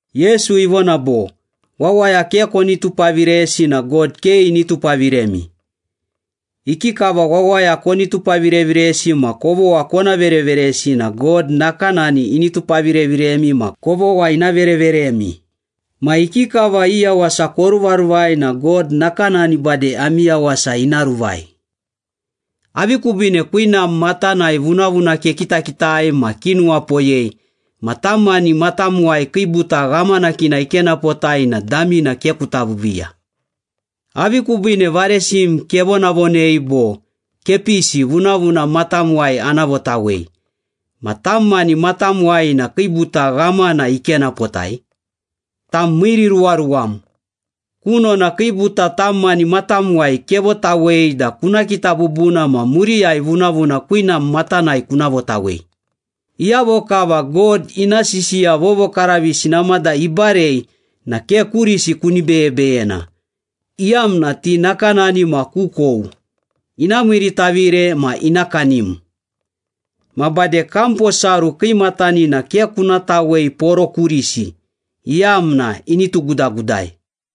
Yesu ivona bo, “Wawaya ke koni tupaviresi na God ke ini tupavirem. Ikikava wawaya koni tupavireviresi ma kovogha kona vereveresi na God nakanani ini tupavireviremi ma kovogha ina vereveremi. Ma ikikava i yawasa koruvaruvai na God nakanani bade ami yawasa ina ruvai. Avi kubiine kwinam matanai vunavuna kekitakitai ma kinuwapoyei ma tam mani matamuwai kiibuta ghamanakina ikenapotai na damina ke kuta viiviiya? Avi kubiine varesim kevonavonei bo, ‘Kepisi, vunavuna matamuwai ana votawei,’ ma tam mani matamuwai na kiibuta ghamana ikenapotai? Tam miiriruwaruwam! Kunona kiibuta tam mani matamuwai kevotawei da kuna kita bubuna ma muriyai vunavuna kwinam matanai kuna votawei.” “Iyavo kava God ina sisiya vovokaravisi namada ibarei na ke kurisi kuni beyebeyena, iyamna ti nakanani ma kukou, ina miiritavire ma ina kanim. Ma bade kam posaru kiimatanina ke kuna tawei poro kurisi, iyamna ini tugudagudai.”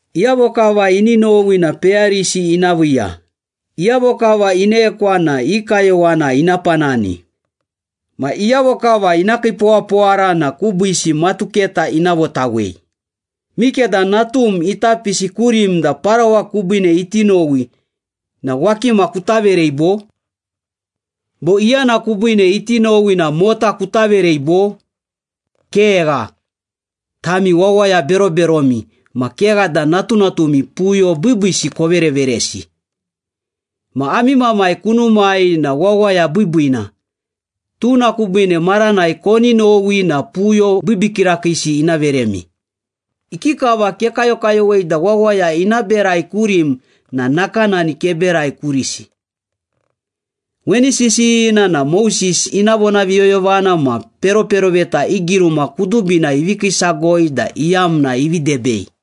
Iyavo kava ini nowi na peyarisi ina viiya. Iyavo kava inekwa na ina kayowana ina panani. Ma iyavo kava ina kiipowapowara na kubiisi matuketa ina votawei. Mikeda natum ita pisi kurim da parawa kubiine iti nowi na wakima kuta verei, bo? Bo iyana kubiine iti nowi na mota kuta verei, bo? Kegha! Tami wawaya beroberomi, ma kegha da natunatumi puyo biibiisi kovereveresi. Ma ami Mamai kunumai na wawaya biibiina. Tuna kubiine maranai koni nowi na puyo biibii kirakiisi ina veremi.” “Ikikava kekayokayowei da wawaya ina berai kurim na nakanani keberai kurisi. Weni sisiyina na Moses ina vonaviyoyovana ma peroperoveta i giruma kudubina ivi kiisagoi da iyamna ivi debei.”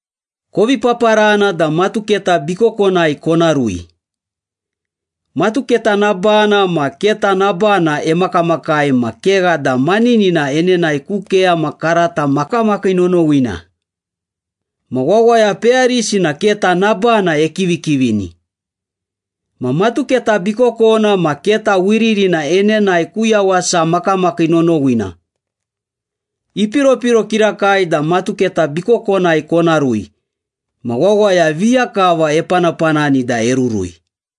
“Kovi paparana da matuketa bikokonai kona rui. Matuketa nabana ma keta nabana emakamakai ma kegha da maninina enenae ku keyama karata makamakii nonowina. Ma wawaya peyarisi na keta nabana ekivikivini. Ma matuketa bikokona ma keta wiririna enenae ku yawasa makamakii nonowina. Ipiropiro kirakai da matuketa bikokonai kona rui, ma wawaya viya kava epanapanani da erurui.”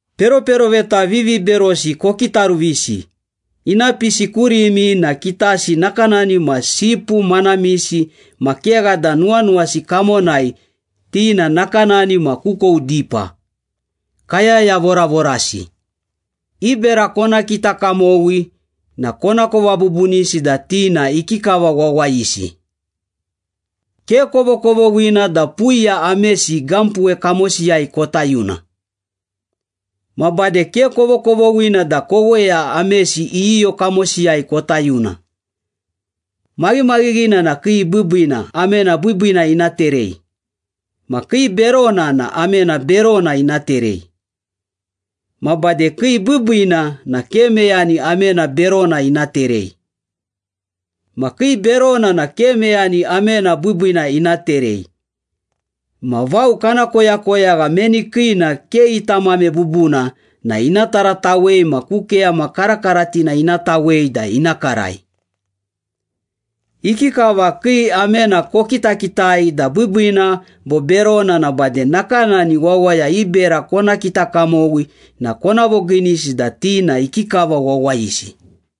“Peroperoveta viviberosi kokitaruvisi. Ina pisi kurimi na kitasi nakanani ma sipu manamisi ma kegha da nuwanuwasi kamonai ti na nakanani ma kukou dipa, kayaya voravorasi. I bera kona kita kamowi na konakova bubunisi da ti na ikikava wawayisi. Ke kovokovoghina da puiya amesi gampuwe kamosiyai kota yuna. Ma bade ke kovokovoghina da koweya amesi iyiyo kamosiyai kota yuna. Maghimaghighina na kii biibiina amena biibiina ina terei. Ma kii berona na amena berona ina terei. Ma bade kii biibiina na ke meyani amena berona ina terei. Ma kii berona na ke meyani amena biibiina ina terei. Ma vao kana koyakoyagha meni kiina ke ita amame bubuna na ina taratawei ma ku keyama karakaratina ina tawei da ina karai. Ikikava kii amena kokitakitai da biibiina bo berona na bade nakanani wawaya i bera kona kita kamowi na kona vogiinisi da ti na ikikava wawayisi.”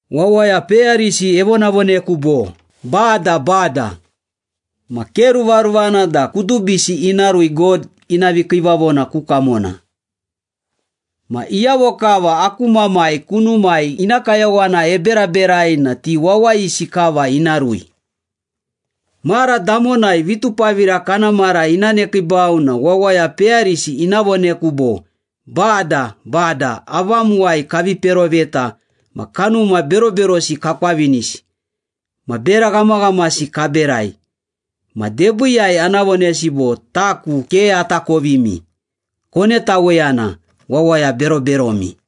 “Wawaya peyarisi evonavoneku bo, ‘Bada, Bada.’ Ma ke ruvaruvana da kudubisi ina rui God ina vikiivavona ku kamona. Ma iyavo kava aku Mamai kunumai ina kayowana eberaberai na ti wawayisi kava ina rui. Mara damonai, vitupavira kana mara ina nekiibau na wawaya peyarisi ina voneku bo, ‘Bada, Bada, avamuwai kavi peroveta ma kanuma beroberosi kakwavinisi ma bera ghamaghamasi kaberai.’ Ma debiiyai ana vonesi bo, ‘Taku ke atakovimi. Konetaweyana, wawaya beroberomi!’”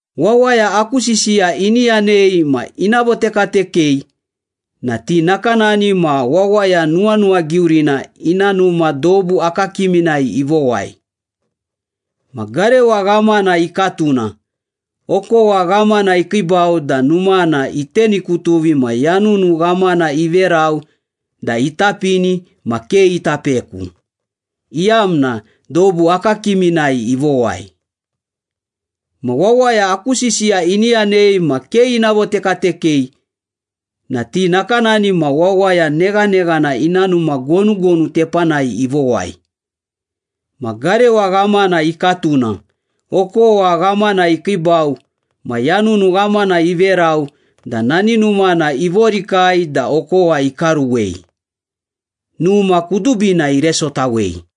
“Wawaya aku sisiya ini yanei ma ina votekatekei na ti nakanani ma wawaya nuwanuwagiurina ina numa dobu akakiminai ivowai. Ma garewa ghamana ikatuna, okowa ghamana ikiibau da numana itenukutuvi ma yanunu ghamana iverau da itapini, ma ke ita peku, iyamna dobu akakakiminai ivowai.” “Ma wawaya aku sisiya ini yanei ma ke ina votekatekei na ti nakanani ma wawaya neghaneghana ina numa gonugonu tepanai ivowai. Ma garewa ghamana ikatuna, okowa ghamana ikiibau ma yanunu ghamana iverau da nani numana ivorikai da okowa ikaruwei. Numa kudubina iresotawei.”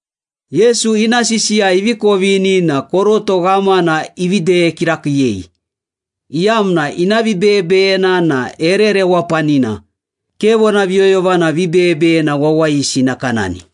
Yesu ina sisiya ivi kovini na koroto ghamana ivi deye kirakiiyei, iyamna ina vibeyebeyena na ere rewapanina, ke vonaviyoyovana vibeyebeyena wawayisi nakanani.